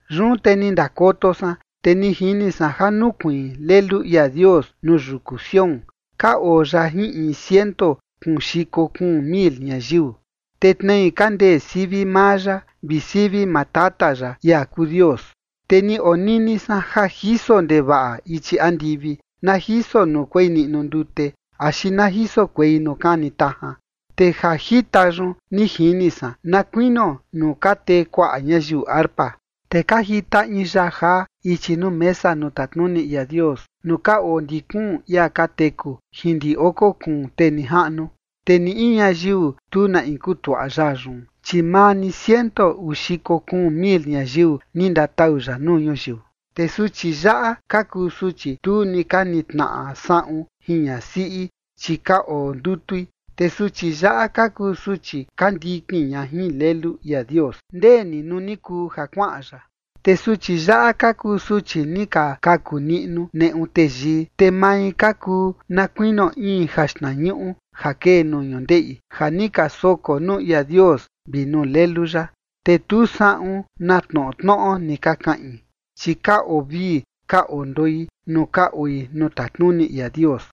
Yun te ni ndakoto san, te ni jini san ja nukuiin Lelu ia Dios nuu yuku Sión, ka oo ya jin in ciento kuun xiko kuun mil ñayiu, te tnei ka ndee sivi maa ya vi sivi maa Tata ya, ia kuu Dios. Te ni onini san ja jiso ndevaꞌa ichi andivi na jiso nuu kuei niꞌnu ndute axi na jiso kuei nuu kani tajan. Te ja jita yun ni jini san na kuinio nuu ka tee kuaꞌa ñayiu arpa. Te ka jita in yaa jaa ichi nuu mesa nuu tatnuni ia Dios, nuu ka oo ndi kuun ia ka teku jin ndi oko kuun tee nijaꞌnu. Te ni in ñayiu tu na in kutuaꞌa yaa yun, chi maa ni ciento uu xiko kuun mil ñayiu ni ndatau ya nuu ñuyiu. Te suchi yaꞌa ka kuu suchi tu ni ka nitnaꞌa saꞌun jin ñasiꞌi, chi ka oo ndutui. Te suchi yaꞌa ka kuu suchi ka ndikin ña jin Lelu ia Dios ndeni nuu ni kuu ja kuaꞌan ya. Te suchi yaꞌa ka kuu suchi ni ka kaku niꞌnu neꞌu teyii. Te mai ka kuu na kuinio in jaxtnañuꞌu ja kee nuu ñundeꞌi ja ni ka soko nuu ia Dios vi nuu Lelu ya. Te tu saꞌun na tnoꞌo tnoꞌo ni ka kaꞌin, chi ka oo vii ka oo ndoi nuu ka oi nuu tatnuni ia Dios.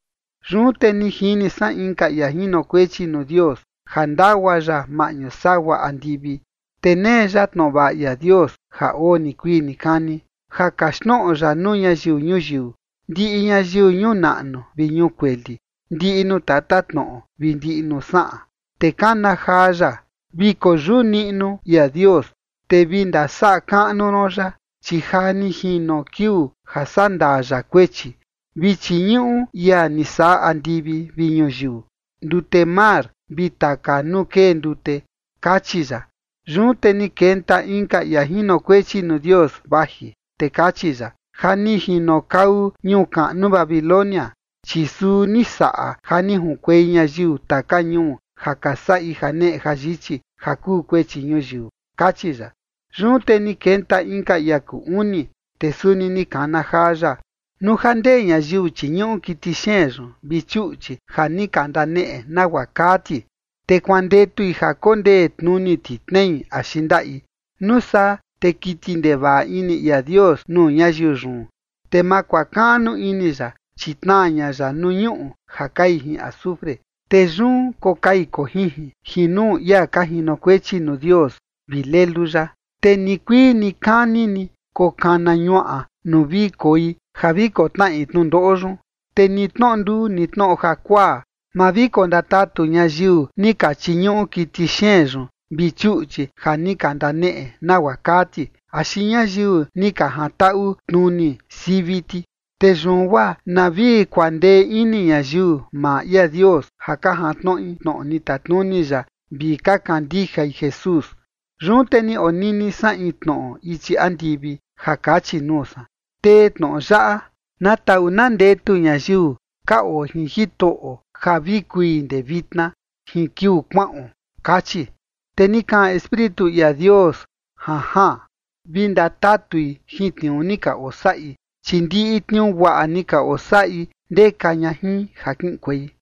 Yun te ni jini san inka ia jinokuechi nuu Dios ja ndagua ya maꞌñu sagua andivi. Te nee ya tnoꞌo vaꞌa ia Dios ja oo nikuii nikani, ja kaxtnoꞌo ya nuu ñayiu ñuyiu, ndiꞌi ñayiu ñuu naꞌnu vi ñuu kueli, ndiꞌi nuu tatatnoꞌo vi ndiꞌi nuu saꞌan. Te kana jaa ya: ―Vi koyuꞌu niꞌnu ia Dios, te vi ndasaꞌa kaꞌnu ron ya, chi ja ni jino kiuu ja sandaa ya kuechi. Vi chiñuꞌu ia ni saꞌa andivi vi ñuyiu, ndute mar, vi taka nuu kee ndute ―kachi ya. Yun te ni kenta inka ia jinokuechi nuu Dios vaji, te kachi ya: ―Ja ni jinokau ñuu kaꞌnu Babilonia, chi suu ni saꞌa ja ni junkuei ñayiu taka ñuu ja ka saꞌi janeꞌe jayichi ja kuu kuechi ñuyiu ―kachi ya. Yun te ni kenta inka ia kuu uni, te suni ni kana jaa ya: ―Nuu ja ndee ñayiu chiñuꞌu kiti xeen yun vi chuꞌchi ja ni ka ndaneꞌe nagua kaa ti, te kuandetui ja kondee tnuni ti tnei axi ndaꞌi, nuu saa te kiti ndevaꞌa ini ia Dios nuu ñayiu yun, te ma kuakaꞌnu ini ya, chi tnaa ña ya nuu ñuꞌu ja kai jin azufre, te yun kokai kojinjin jin nuu ia ka jinokuechi nuu Dios vi Lelu ya. Te nikuii nikani ni kokana ñuaꞌa nuu vi koi ja vi kotnaꞌi tnundoꞌo yun. Te ni tnoꞌo nduu ni tnoꞌo jakuaa, ma vi kondatatu ñayiu ni ka chiñuꞌu kiti xeen yun vi chuꞌchi ja ni ka ndaneꞌe nagua kaa ti, axi ñayiu ni ka jantaꞌu tnuni sivi ti. Te yun guaa na vi kuandee ini ñayiu maa ia Dios ja ka jantnoꞌi tnoꞌo ni tatnuni ya vi ka kandijai Jesús. Yun te ni onini san in tnoꞌo ichi andivi ja kachi nuu san: ―Tee tnoꞌo yaꞌa: “Na taꞌu na ndetu ñayiu ka oo jin Jitoꞌo ja vi kui ndee vitna jin kiuu kuaꞌon” kachi. Te ni kaꞌan Espíritu ia Dios: “Janjaan. Vi ndatatui jin tniuu ni ka osaꞌi, chi ndiꞌi tniuu guaꞌa ni ka osaꞌi ndeka ña jin ja kiꞌinkuei”.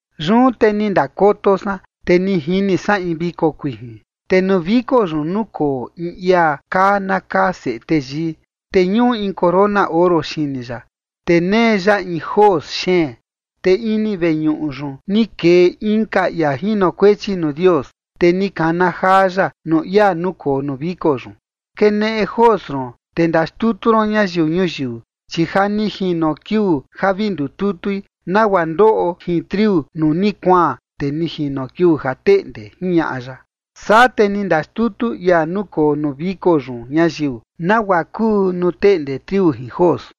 Yun te ni ndakoto san, te ni jini san in viko kuijin. Te nuu viko yun nukoo in ia kaa na kaa Seꞌe Teyii, te ñuꞌu in corona oro xini ya, te nee ya in jos xeen. Te ini veñuꞌu yun ni kee inka ia jinokuechi nuu Dios, te ni kana jaa ya nuu ia nukoo nuu viko yun: ―Keneꞌe jos ron, te ndaxtutu ron ñayiu ñuyiu. Chi ja ni jino kiuu ja vi ndututui nagua ndoꞌo jin triu nuu ni kuaan, te ni jino kiuu ja teꞌnde ―jiñaꞌa ya. Saa te ni ndaxtutu ia nukoo nuu viko yun ñayiu, nagua kuu nuu teꞌnde triu jin jos.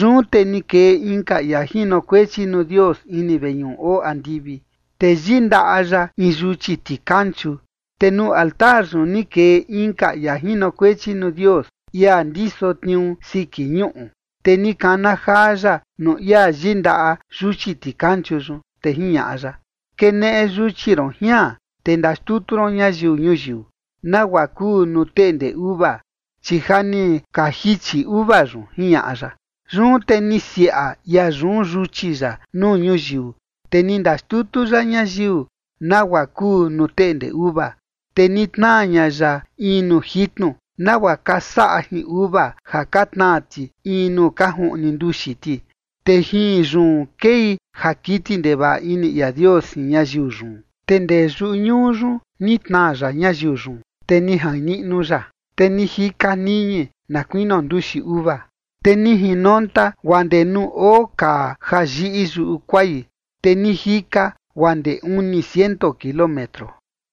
Yun te ni kee inka ia jinokuechi nuu Dios ini veñuꞌu oo andivi, te yindaꞌa ya in yuchi tikanchu. Te nuu altar yun ni kee inka ia jinokuechi nuu Dios, ia ndiso tniuu siki ñuꞌu, te ni kana jaa ya nuu ia yindaꞌa yuchi tikanchu yun, te jiñaꞌa ya: ―Keneꞌe yuchi ron jian, te ndaxtutu ron ñayiu ñuyiu, nagua kuu nuu teꞌnde uva, chi ja ni ka jichi uva yun ―jiñaꞌa ya. Yun te ni siaꞌa ia yun yuchi ya nuu ñuyiu, te ni ndaxtutu ya ñayiu, nagua kuu nuu teꞌnde uva, te ni tnaa ña ya in nuu jitnu, nagua ka saꞌa jin uva ja ka tnaa ti in nuu ka juꞌni nduxi ti, te jin yun kei ja kiti ndevaꞌa ini ia Dios jin ñayiu yun. Te ndee yuꞌu ñuu yun ni tnaa ya ñayiu yun, te ni jain niꞌnu ya, te ni jika niñi na kuinio nduxi uva. Te ni jinonta guaa ndee nuu oo kaa ja yiꞌi yuꞌu kuai, te ni jika guaa ndee uni ciento kilómetro.